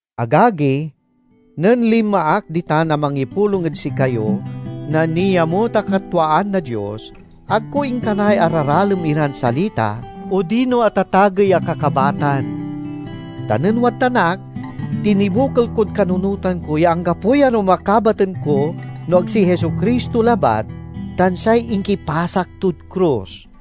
Agagi, nen linma ak ditan a mangipulong ed sikayo na niamut a katwaan na Dios, ag ko inkanay araralem iran salita odino atatagey a kakabatan. Ta nen wadtan ak, tinibokel kod kanunotan ko ya anggapoy arum a kabaten ko no ag si Jesu-Cristo labat, tan say inkipasak tod krus.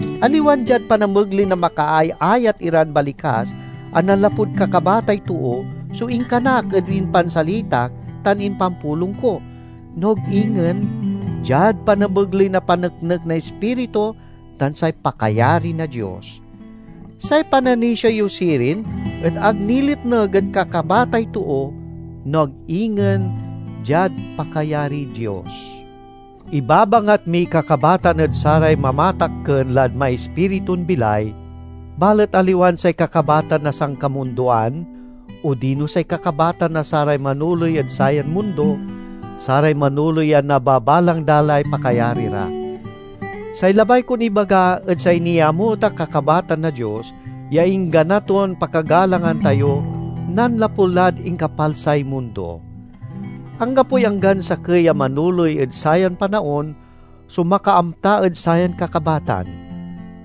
Aliwan diad panamegley na makaayayat iran balikas a nanlapud kakabatay too so inkanak ed impansalitak tan impanpulong ko, no ag ingen diad panamegley na paneknek na Ispiritu tan say pakayari na Dios. Say pananisia yo sirin et ag niletneg ed kakabatay too, no ag ingen diad pakayariy Dios. Ibabangat miy kakabatan ed saray mamatakken lad maispiritun bilay, balet aliwan say kakabatan na sankamundoan odino say kakabatan na saray manoley ed sayan mundo, saray manoley a nababalang da lay pakayari ra. Say labay kon ibaga et say niamut a kakabatan na Dios, ya inggana ton pakagalangan tayo nanlapu lad inkapalsay mundo. Anggapoy anggan sakey a manoley ed sayan panaon so makaamta ed sayan kakabatan.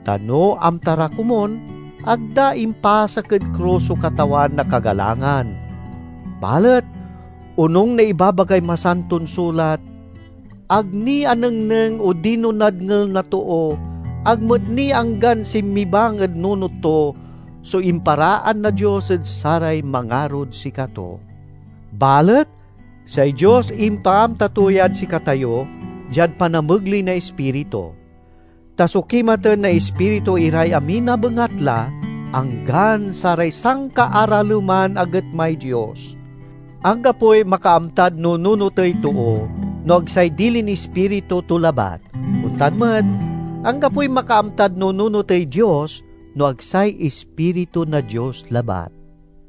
Ta no amta ra komun, ag da impasak ed krus so Katawan na kagalangan. Balet onung na ibabagay Masanton Sulat, "Ag ni anengneng odino nadngel na too, ag met ni anggan sinmibang ed nunot to, so imparaan na Dios ed saray mangarod sikato." Balet say Dios impaamta to yad sikatayo diad panamegley na Ispiritu. Ta sokimaten na Ispiritu iray amin a bengatla, anggan saray sankaaraleman a getmay Dios. Anggapoy makaamtad nununotey too, no ag say dilin ispiritu to labat. Ontan met, anggapoy makaamtad nununotey Dios, no ag say Ispiritu na Dios labat.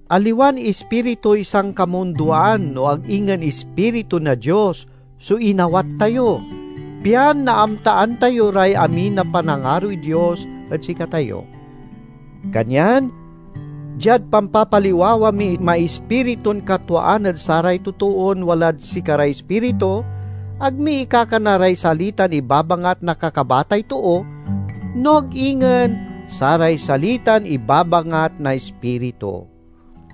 Aliwan ispirituy sankamundoan no ag ingen Ispiritu na Dios so inawat tayo, pian naamtaan tayo ray amin a panangaroy Dios ed sikatayo. Kanyan diad pampapaliwawa miy maispiritun katwaan ed saray totoon walad sikaray Ispiritu, ag mi ikakana ray salitan ibabangat na kakabatay too, no ag ingen saray salitan ibabangat na Ispiritu.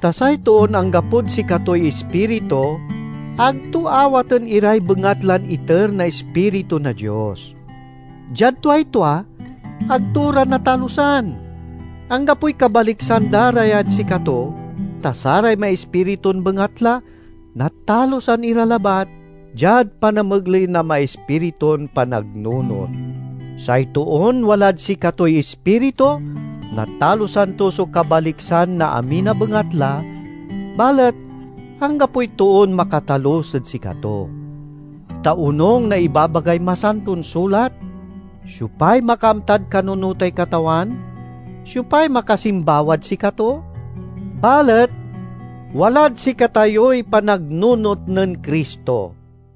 Ta say toon anggapod sikatoy Ispiritu ag to awaten iray bengatlan iter na Ispiritu na Dios. Diad tuay tua, ag to ra natalusan; anggapoy kabaliksan da ra yad sikato, ta saray maispiritun bengatla natalusan ira labat diad panamegley na maispiritun panagnunot. Say toon walad sikatoy Ispiritu natalusan to so kabaliksan na amin a bengatla, balet anggapoy toon makatalus ed sikato. Ta onung na ibabagay Masanton Sulat, "Siopay makaamtad kanunotay Katawan? Siopay makasimbawad sikato?" Balet, walad sikatayoy panagnunot nen Cristo.